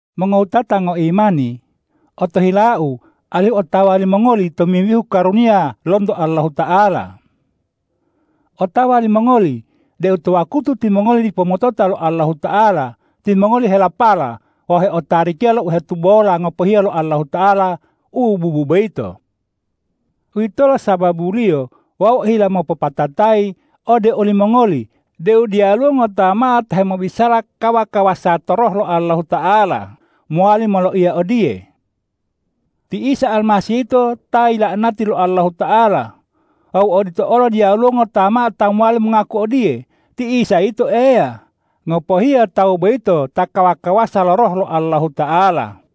Mongowutata ngoimani, otohilau alihu otawa limongoli tomimbihu karuniya lonto Allahuta'ala. Otawa limongoli deu to wakutu timongoli dipo motota to Allahuta'ala, timongoli helapala wawu heotarikiya lo u hetubola ngopohiya lo Allahuta'ala u bubu boyito. Uwitolo sababuliyo wau ohila mopopatatayi ode olimongoli deu diyaluwo ngota mao ta hemobisala kawa-kawasa to Roh lo Allahuta'ala mowali moloiya odiye,”Ti Isa Almasih yito ta yila'anati lo Allahuta'ala.” Wawu odito olo diyaluwo ngota mao ta mowali mongaku odiye,”Ti Isa yito Eya,” ngopohiya tawu boyito ta kawa-kawasa lo Roh lo Allahuta'ala.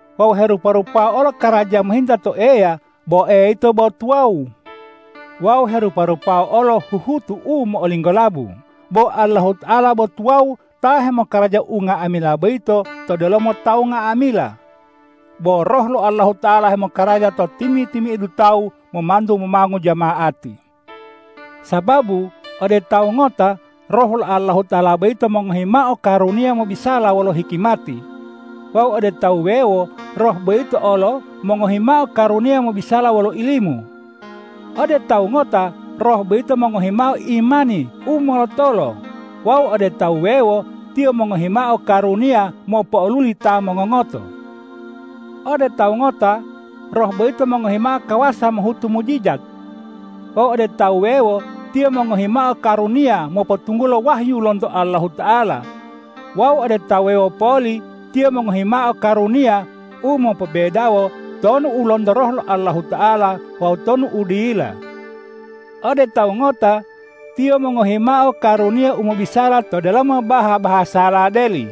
Wawu herupa-rupawa olo karaja mohinta to Eya, bo Eya yito bo tuwawu. Wawu herupa-rupawa olo huhutu u mo'olinggolabu, bo Allahuta'ala bo tuwawu ta hemokaraja unga'amila boyito to delomo tawu nga'amila. Bo Roh lo Allahuta'ala hemokaraja to timi-timi'idu tawu momantu momongu jama'ati. Sababu ode tawu ngota Roh lo Allahuta'ala boyito mongohi mao karuniya mobisala wolo hikimati; wawu ode ta wuwewo Roh boyito olo mongohi mao karuniya mobisala wolo ilimu. Ode tawu ngota Roh boyito mongohi mao imani u molotolo; wawu ode ta wuwewo Tiyo mongohi mao karuniya mopo'oluli ta mongongoto. Ode tawu ngota Roh boyito mongohi mao kawasa mohutu mujijat; wawu ode ta wuwewo Tiyo mongohi mao karuniya mopotunggulo wahyu lonto Allahuta'ala; wawu ode tawu wuwewo poli Tiyo mongohi mao karuniya u mopobedawo tonu u lonto Roh Allahuta'ala wawu tonu u dila. Ode tawu ngota Tiyo mongohi mao karuniya u mobisala to delomo baha-bahasala deli;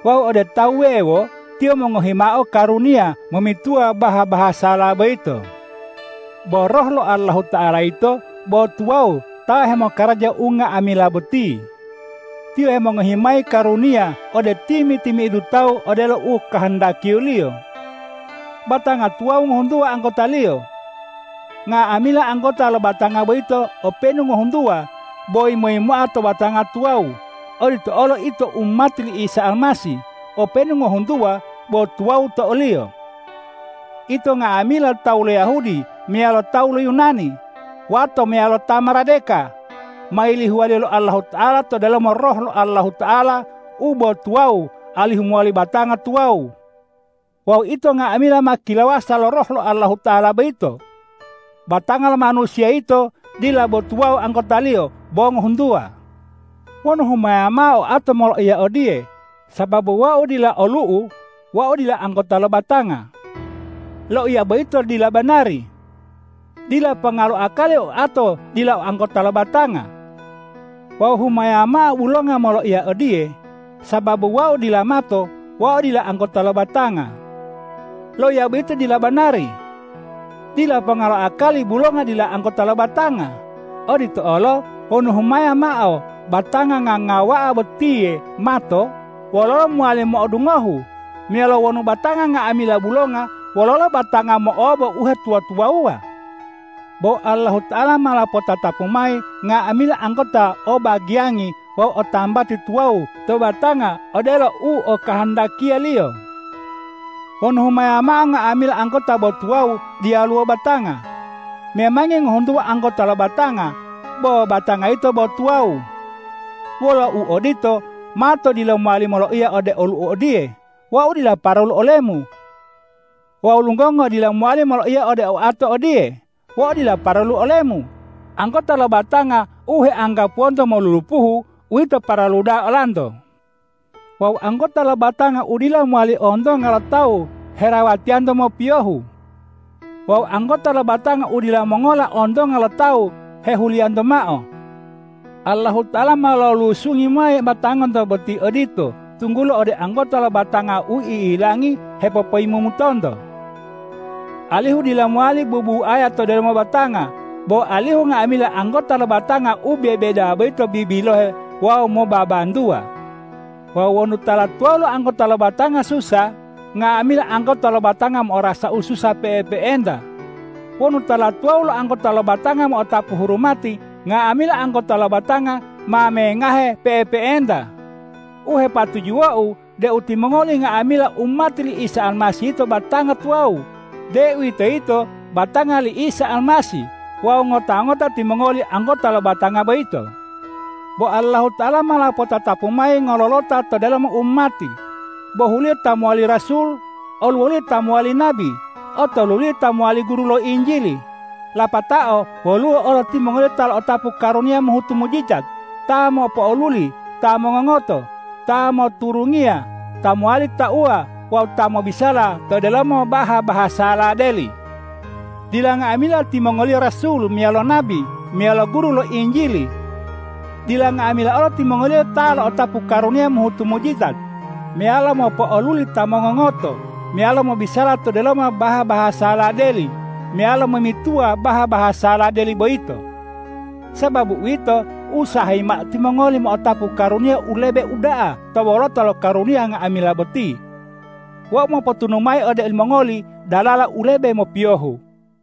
wawu ode ta wuwewo Tiyo mongohi mao karuniya momituwa baha-bahasala boyito. Bo Roh lo Allahuta'ala yito bo tuwawu ta hemokaraja unga'amila boti. Tiyo hemongohi mayi karuniya ode timi-timi'idu tawu odelo u okahandakiya-Liyo. Batanga tuwawu ngohuntuwa anggotaliyo. Nga'amila anggota lo batanga boyito openu ngohuntuwa, bo yimo-yimoa to batanga tuwawu; odito olo ito umati li Isa Almasih, openu ngohuntuwa bo tuwawu to o-Liyo. Ito nga'amila tawu lo Yahudi meyalo tawu lo Yunani, wato meyalo ta maradeka, ma yilihuwa lo Allahuta'ala to delomo Roh lo Allahuta'ala u bo tuwawu alihu mowali batanga tuwawu. Wawu ito nga'amila ma kilawasa lo Roh lo Allahuta'ala boyito. Batanga lo manusiya yito dila bo tuwawu anggotaliyo, bo ngohuntuwa. Wonu humaya mao oato moloiya odiye,”Sababu wau dila olu'u, wau dila anggota lo batanga.” Loiya boyito dila banari. Dila ponga lo akali oato dila anggota lo batanga. Wawu humaya mao bulonga moloiya odiye,”Sababu wau dila mato, wau dila anggota lo batanga.” Loiya boyito dila banari. Dila ponga lo akali bulonga dila anggota lo batanga. Odito olo wonu humaya mao batanga ngangawa'a botiye mato, wololo mowali mo'odungohu? Meyalo wonu batanga nga'amila bulonga, wololo batanga mo'obo uhetuwa-tuwawuwa? Bo Allahuta'ala ma lopotatapu mayi nga'amila anggota o bagiyangi wawu o tambati tuwawu to batanga odelo u okahandakiya-Liyo. Wonu humaya mao nga'amila anggota bo tuwawu, diyaluwo batanga. Memangi ngohuntuwa anggota lo batanga, bo batanga yito bo tuwawu. Wolo uodito, mato dila mowali moloiya ode olu'u odiye,”Wau dila paralu olemu.” Wawu lunggongo dila mowali moloiya ode oato odiye,”Wau dila paralu olemu.” Anggota lo batanga u heanggapuwonto molulupuhu, uwito paralu da'a olanto. Wawu anggota lo batanga u dila mowali ontonga lo tawu herawatiyanto mopiyohu. Wawu anggota lo batanga u dila mongola ontonga lo tawu hehuliyanto mao. Allahuta'ala ma lolusungi mayi batanganto boti odito, tunggulo ode anggota lo batanga u i'ilangi hepopoyimumutonto, alihu dila mowali bubuaya to delomo batanga, bo alihu nga'amila anggota lo batanga u bebedawa boyito bibilohe wawu mobabantuwa. Wawu wonu tala tuwawu lo anggota lo batanga susa, nga'amila anggota lo batanga mo'orasa ususa pe'epe'enta. Wonu tala tuwawu lo anggota lo batanga mo'otapu hurumati, nga'amila anggota lo batanga ma mengahe pe'epe'enta. U hepatujuwou deu timongoli nga'amila umati li Isa Almasih yito batanga tuwawu, deuwitoyito batanga li Isa Almasih, wawu ngota-ngota timongoli anggota lo batanga boyito. Bo Allahuta'ala ma lopotatapu mayi ngololota to delomo umati, bohuliyo ta mowali rasul, oluwoliyo ta mowali nabi, otoluliyo ta mowali guru lo Injili. Lapatao woluwo olo timongoliyo ta lo'otapu karuniya mohutu mujijat, ta mopo'oluli ta mongongoto, ta moturungiya, ta mowali tauwa wawu ta mobisala to delomo baha-bahasala deli. Dila nga'amila timongoliyo rasul, meyalo nabi meyalo guru lo Injili. Dila nga'amila olo timongoliyo ta lo'otapu karuniya mohutu mujijat, meyalo mopo'oluli ta mongongoto, meyalo mobisala to delomo baha-bahasala deli meyalo momituwa baha-bahasala deli boyito. Sababu uwito, usahayi mao timongoli mo'otapu karuniya u lebe uda'a to wolota lo karuniya nga'amila boti. Wau mopotunu mayi ode olimongoli dalala u lebe mopiyohu.